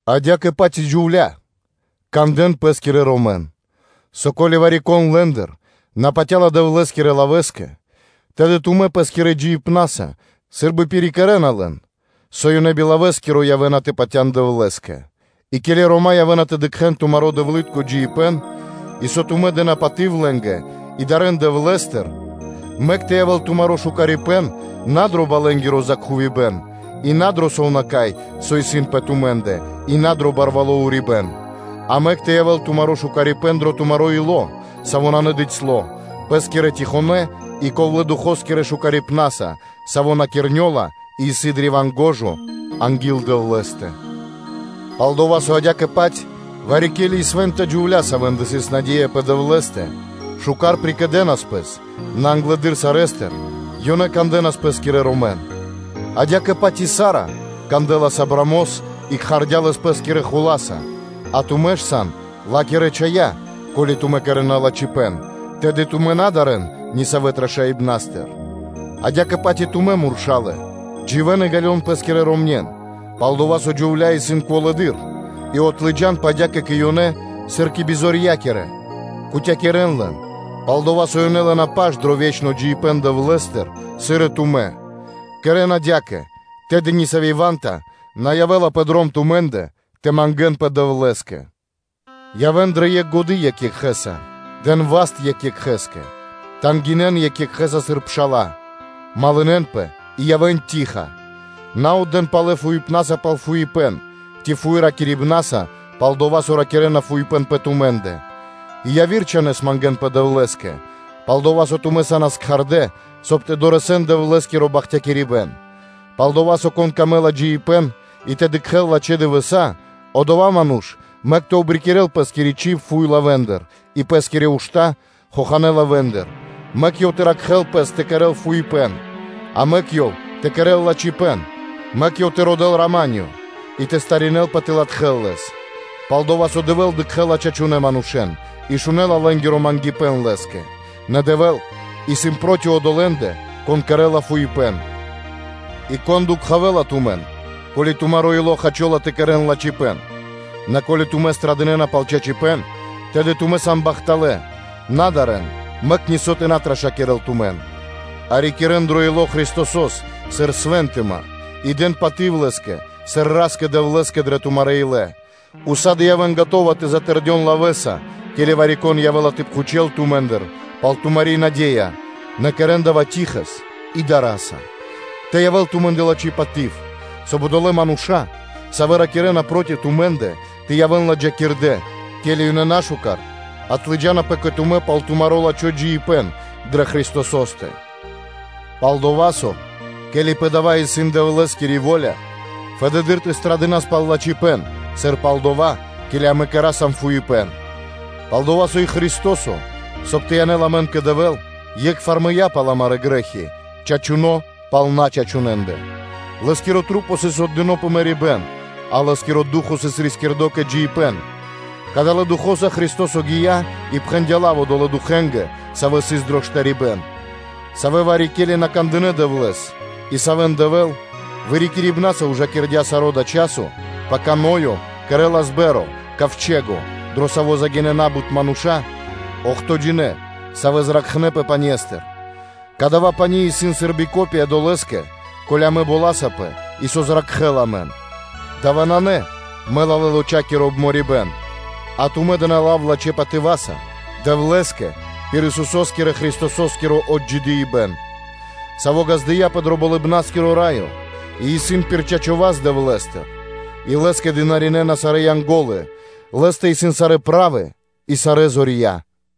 Адя́кэ-паць и джувля́лэ, кандэ́н пэ́скирэ ромэн, со ко́ли вари-кон лэ́ндыр на патя́ла Дэвлэ́скирэ лавэ́скэ, тэды тумэ́ пэ́скирэ джиибнаса сы́рбы пирикэрэна лэн, со ёнэ би лавэскиро явэ́на тэ патя́н Дэвлэ́скэ, и ке́ли рома́ явэ́на тэ дыкхэ́н тумаро́ дэвлы́тко джиибэ́н, и дова́, со тумэ́ дэ́на паты́в лэ́нгэ и дарэ́н Дэвлэ́стыр; мэк тэ явэ́л тумаро́ шукарипэ́н на дро балэнгиро закхувибэн и на дро сувнака́й, со исын пэ тумэ́ндэ и на дро барвало́ урибэ́н; а мэк тэ явэ́л тумаро́ шукарипэ́н дро тумаро́ ило́, саво́ исын надыцьло (набицяло), пэ́скирэ штылонэ́ и ковлэ́-илэ́скирэ шукарибна́са, саво́ на кирнёла и исын древа́н шука́р анги́л Дэвлэ́стэ. Пал-дова́ со адя́кэ-паць вари-ке́ли и свэ́нта джувля́, савэ́ндэ сыс наде́я пэ Дэвлэ́стэ, шука́р прикэдэнас пэс, нэ англэды́р сарэ́стыр ёнэ кандэнас пэ́скирэ ромэн; адя́кэ-паць и Сара кандэлас Авраамос и кхардя́ лэс пэ́скирэ хула́са, а тумэ́ ж сан ла́кирэ чхая́, ко́ли тумэ́ кэрэ́на лачхипэ́н, тэды тумэ́ на дарэ́н нисавэ трашаибнастыр. Адя́кэ-паць и тумэ́, муршалэ, дживэ́н и ґалён пэ́скирэ ромнен, пал-дова́ со джувлендэ исын тыкнэды́р зор и отлыджанпэ адя́кэ кэ ёнэ, сыр кэ бизорья́кирэ, кутякирэ́н (уважынэн) лэн, пал-дова́ со ёнэ лэ́на паш дро ве́чно джиибэ́н Дэвлэ́стыр, сыр и тумэ́. Кэрэ́н адя́кэ, тэды ни сави́ ва́нта (сцяна) на явэ́ла пэ дром тумэ́ндэ тэ мангэ́нпэ Дэвлэ́скэ. Явэ́н дрэ екх годы́ екх екхэ́са, подэн васта́ екх екхэ́скэ дро пхарипэ́н, тангинэ́н (жалинэн) екх екхэ́с, сыр пша́ла, малынэнпэ (дружынэн) и явэ́н ковлэ́-илы́тка, на отдэ́н палэ фуипнаса пал фуипэ́н, ци фуй ракирибнаса пал дова́, со ракирэ́на фуипэ́н пэ тумэ́ндэ: а пэ яви́р мангэ́нпэ Дэвлэ́скэ, пал-дова́ со тумэ́ са́нас кхардэ́, соб (кай) тэ дорэсэн Дэвлэ́скиро бахтякирибэ́н. Палдова́ со: “Конэ́скэ исын дро́го джиибэ́н и тэ дыкхэ́л лачхэ́ дывэса́, одова́ ману́ш мэк тэ обрикирэл пэ́скири чиб фуе́ лавэ́ндыр и пэ́скирэ ушта́ хоханэ́ лавэ́ндыр, мэк ёв тэ ракхэ́л пэс тэ кэрэ́л фуипэ́н, а мэк ёв тэ кэрэ́л лачхипэ́н; мэк ёв тэ родэ́л рама́нё (миро) и тэ причхувэл зор тэ латхэл лэс; пал-дова́ со Дэвэ́л дыкхэ́ла чачунэ́ манушэ́н и шунэ́ла лэ́нгиро мангипэ́н Лэ́скэ; нэ Дэвэ́л исын проти одолэ́ндэ, кон кэрэ́ла фуипэ́н.” И кон дукхавэла тумэн, ко́ли тумаро́ ило́ хачола тэ кэрэ́н лачхипэ́н? Нэ ко́ли тумэ́ злыджана пхарипэ́н пал чачипэ́н, тэды тумэ́ сан бахталэ́, на дарэ́н, мэк нисо́ тэ на трашакирэл тумэн; а рикирэ́н дро ило́ Христосо́с сыр Свэнтыма и дэн паты́в Лэ́скэ, сыр Ра́скэ-Дэвлэ́скэ дрэ тумарэ́ илэ, уса́ды / сак (всегда) явэ́н скэдынэ́ тэ затэрдён лавэ́са, ке́ли вари-кон явэ́ла тэ пхучэл тумэ́ндыр пал тумари́ наде́я, нэ кэрэ́н дава́ ковлэ́ илэ́са и дара́са; тэ явэ́л тумэ́ндэ лачхи́ паты́в, соб (кай) одолэ́ мануша́, савэ́ ракирэ́на проти тумэ́ндэ, тэ явэ́н ладжакирдэ́, ке́ли ёнэ нашукар отлыджанапэ кэ тумэ́ пал тумаро́ лачхо́ джиибэ́н дрэ Христосо́стэ. Пал-дова́ со, ко́ли пэ дава́ исын Дэвлэ́скири во́ля, фэды́р тэ лыджас пхарипэ́н пал лачхипэ́н, сыр пал дова́, ке́ли амэ кэра́са фуипэ́н; пал-дова́ со и Христо́со, соб (кай) тэ янэл амэн кэ Дэвэ́л, е́кхвар мыя́ пал амарэ́ грэ́хи, чачуно́ пал начачунэндэ, Лэ́скирэ Маса́ сыс отдынэ́ пэ мэрибэ́н, а Лэ́скиро Ду́хо (Фа́но) сыс рискирдо кэ джиибэ́н; кадалэ́ Духо́са Христо́со гия́ и пхэндя́ лав одолэ́ духэнгэ, савэ́ сыс дро штарибэ́н; савэ́ вари-ке́ли на кандынэ́ Дэвлэ́с, и савэ́н Дэвэ́л вырикирибнаса ужакирдя саро́ дава́ часо, пака Ноё кэрэ́лас ковчэго (мохто́), дро саво́ загинэ́ на́бут мануша́, охтоджинэ (бидуе́нгиро дэш), савэ́ зракхнэпэ пане́стыр: дава́ пани́ исын сы́рбы копия долэ́скэ, ке́ли амэ боласапэ и со зракхэ́ла амэн. Дава́ нанэ мэлалэ́-лоча́киро обморибэн, а тумэ́ дэ́на лав лачхэ́ патыва́са Дэвлэ́скэ пир Исусо́скирэ-Христосо́скиро отджидыипэн, Саво́ ґаздыя́пэ дро Болыбна́скиро Раё и исын пир чачо́ васт Дэвлэ́стыр, и Лэ́скэ дынаринэна сарэ́ Янго́лы, Лэ́стэ исын сарэ́ правы и сарэ́ зорья.